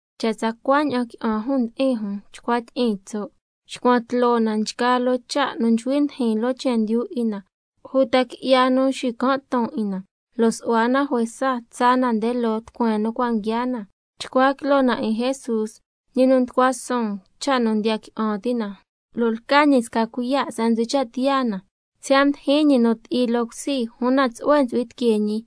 Cha' tsa cuaña'an qui'an jun ndi'in jun chcua tyi'iin tso', xcuan tloo na nchgaa loo cha' nu nchcui ndijin loo chendyu 'in na uta qui'ya nu nxican' ton 'in na, lo' su'hua na juesa tsaa na nde loo tucueen nu cua' nguiaa na. Chcua quiloo na 'in Jesús, ñi nu mducua suun cha' nu ndiya qui'an ti' na, lo' lca ñi sca cuiya' se'en ntsu'hui cha' tiyaa na, siya' mdijin ñi nu ti'i loo cusi, una tsu'hue ntsu'hui tiquee ñi,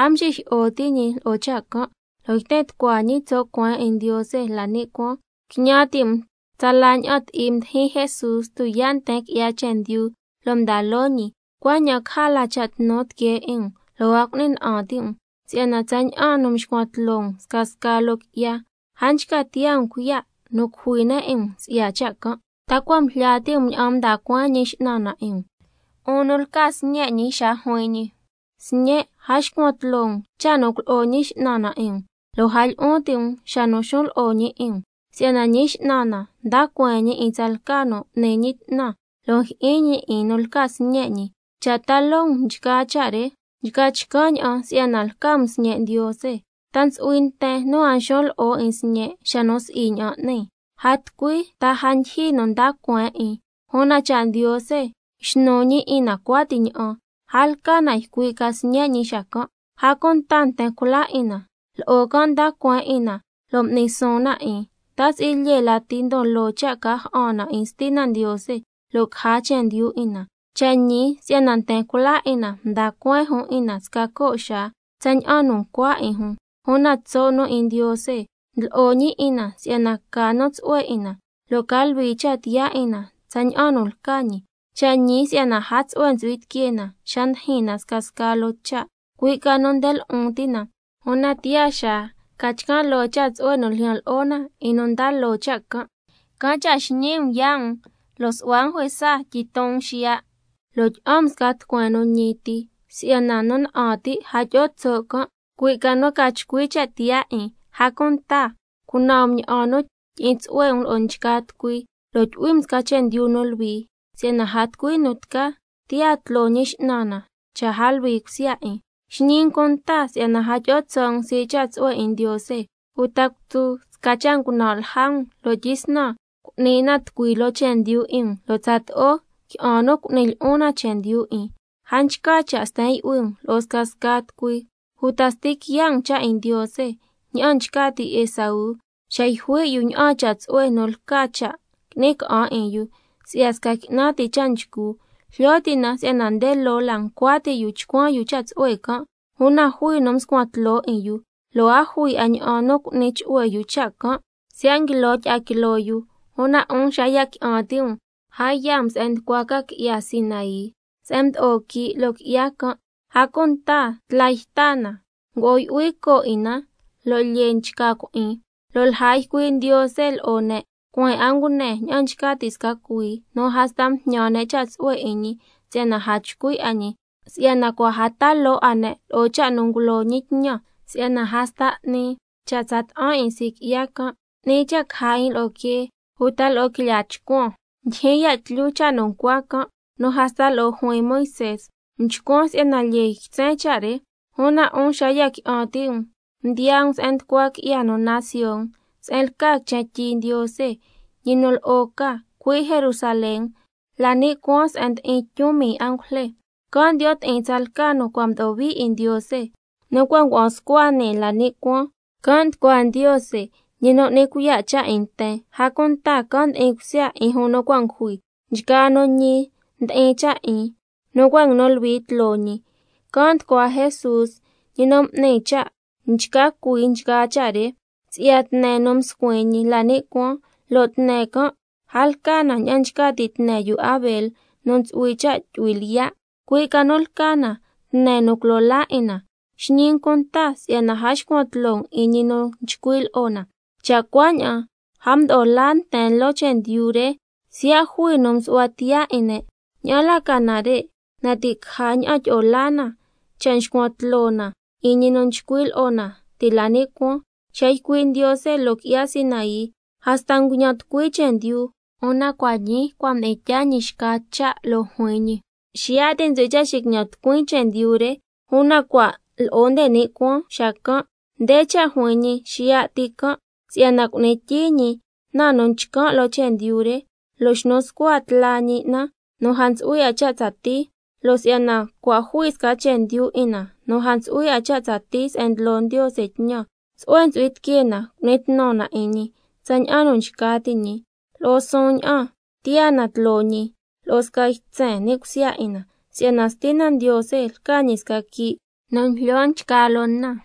a mxijyi'o ti' ñi lo'o cha' can', lo' yten tucua ñi tso' cueen 'in Ndiose la ni' cuaan. Quiñan ti' um tsala ña'an ti'i mdijin Jesús tuyaa' nten qui'ya chendyu lo' mda loo ñi, cuaña'an caja la cha' tnu tiquee 'in um lo' a cu'ni na'an ti' um. Si'yana tsaña'an nu nxcuan tloo um scasca loo qui'ya, a nchca tiyaa um cuiya' nu cujui ne' 'in um si'ya cha' can'. ¿Ta cua' ngujlya ti' um ña'an nda cueen Ñi X'nan na 'in um, 'un nu lca sñe' ñi, xa juin ñi: —Sñen', a xcuan tloo um cha' nu culo'o Ñi X'nan na 'in um, lo' a lyi'un ti' um xa nu xun lo'o ñi 'in um, si'yana Ñi X'nan na nda cueen ñi 'in tsalca nu n'ni ñi 'tnan, lo' njyi'in ñi 'in nu lca sñe' ñi—? Cha' ta loo um nchgaa cha' re, nchca chcan' ña'an si'yana lca um sñe' Ndiose. ¿Ta ntsu'hui nten nu a xun lo'o 'in sñe' xa nu si'i ña'an n'ni? A tucui nu ta a ndyijyi nu nda cueen 'in, una cha' Ndiose xnu ñi 'in na cuati ña'an, a lca na ycui' ca sñe' ñi xacan'. A cunta nten cula 'in na, lo'o can' mda cueen 'in na lo' m'ni suun na 'in, ¿ta si'i lyee lati ndon loo cha' ca ja'an na 'in Stina Ndiose lo' caja chendyu 'in na? Cha' ñi si'yana nten cula 'in na mda cueen jun 'in na sca co' xaa tsaña'an nu ncua 'in jun, una tso' nu 'in Ndiose ndlo'o ñi 'in na si'yana ca nu tsu'hue 'in na, lo' ca luhui cha' tiyaa 'in na tsaña'an nu lca ñi. Cha' ñi si'yana a tucui tsu'hue ntsu'hui tiquee xa ndijin scasca loo cha', cui' ca nu nde lu'un ti' can', una tiyaa xaa nchca chcan' loo cha' tsu'hue nu ljyan lo'o na 'in nu mda loo cha' can'. —Can' cha' xñii um yaa' um lo' su'hua um juesa tyiton um xiya'—, lo' —tyi'an um sca tucueen nu ñi ti—, si'yana nu na'an ti' a tyi'o tso' can', cui' ca nu ca chcui cha' tiyaa 'in. A cunta cunan um ña'an nu tyi'in tsu'hue um lo'o nchgaa tucui lo' tyu'hui um sca chendyu nu luhui, si'yana a tucui nu tca tiyaa tloo Ñi X'nan na cha' a luhui cusya 'in. Xñi um cunta si'yana a tyi'o tso' um sii' cha' tsu'hue 'in Ndiose, uta cutsu sca cha' ngunan' lja um lo' tyisnan cu'ni na tucui loo chendyu 'in um, lo' tsato'o qui'an nu cu'ni lyi'un na chendyu 'in. A nchca cha' sten yu'hui um lo'o scasca tucui uta sti quiya' um cha' 'in Ndiose, ña'an nchca ti' Esaú xa yjui' yu ña'aan cha' tsu'hue nu ntsu'hui cha' qui'ni ca'an 'in yu si'ya sca qui'nan ti cha' nchcu. Jlyo ti' na si'yana nde loo la ncua ti' yu chcuan yu cha' tsu'hue can', una jui nu mscuan tloo 'in yu, lo' a jui 'a ña'an nu cu'ni chu'hue yu cha' can' siya' nguilo tyi'a quiloo yu. Una 'un xa ya qui'an ti' um a yaa um se'en nducua ca qui'ya Sinai, se'en mdo'o quii' loo qui'ya can', a cunta tla yta na, ngo'o yu'hui coo 'in na lo' lyee nchca cui'in, lo' lja ycui' Ndiose lo'o ne' cueen 'a ngune ña'an nchca ti' sca cuhuii, nu hasta mjñan ne' cha' tsu'hue 'in ñi si'yana a chcui' a ñi, si'yana cua' a ta loo 'a ne' lo'o cha' nu ngulo ñi tñan: —Si'yana hasta 'ni cha' tsa ta'an 'in sii' qui'ya can', 'ni cha' caja 'in lo'o quee uta lo'o quilyaa chcuan—. Ndyijyin ya' tlyu cha' nu ncua can', nu hasta lo'o juin Moisé: Mchcuan si'yana lyee nguitsen cha' re. Una 'un xa ya qui'an ti' um mdiyaa um se'en nducua qui'ya nu naan Sion, se'en lca quichen tyi Ndiose, ñi nu lo'o ca, cui' Jerusalén la ni' cuaan se'en ndi'in tyun mii angujle, can' ndiyo' ti'in tsalca nu cua' mdo'o hui 'in Ndiose nu cua' ngua'an scua nii la ni' cuaan, can' nducua Ndiose, ñi nu N'ni Cuiya' Cha' 'in nten, a cunta can' ndi'in cusya 'in jun nu cua' ngujui, nchgaa nu ñi ndi'in cha' 'in nu cua' nguinu luhui tloo ñi, can' nducua Jesús, ñi nu M'ni Cha' nchca cui nchgaa cha' re, si'ya tne nu mscuin ñi la ni' cuaan, lo' tne can' a lca na ña'an nchca ti' tne yu Abel nu ntsu'hui cha' tyu'hui lyiya', cui' ca nu lca na tne nu culo laa 'in na. Xñi um cunta si'yana a xcuan tloo um 'in ñi nu nchcui' lo'o na. Cha' cuaña'an a mdo'o laa nten loo chendyu re siya' jui nu msu'hua tiyaa 'in ne', ña'an la ca nare', na ti' caja ña'an tyi'o laa na cha' xcuan tloo na 'in ñi nu nchcui' lo'o na ti' la ni' cuaan. Xa ycui' Ndiose loo qui'ya Sinai, hasta nguiñan tucui chendyu, una cua' ñii cua' mdi'in tyaa ñi xca cha', lo' juin ñi: —Xiya' ti ntsu'hui cha' xiquiñan tucuin chendyu re, una cua' lo'o nde ni' cuaan xacan'—. Nde cha' juin ñi xiya' ti can', si'yana cu'ni tyii ñi na nu chcan' loo chendyu re, lo' xnu scua tla ñi na nu a ntsu'hui 'a cha' tsatii. Lo' si'yana cua' jui sca chendyu 'in na nu a ntsu'hui 'a cha' tsatii se'en ndlo Ndiose tñan, can' cha' tsu'hue ntsu'hui tiquee na cu'ni tnu na 'in ñi tsaña'an nu nchca ti' ñi, lo'o suun ña'an tiyaa na tloo ñi lo'o sca ytsen ni' cusya 'in na, si'yana —Stina Ndiose lca ñi sca quii' nu njlyo nchgaa loo na—.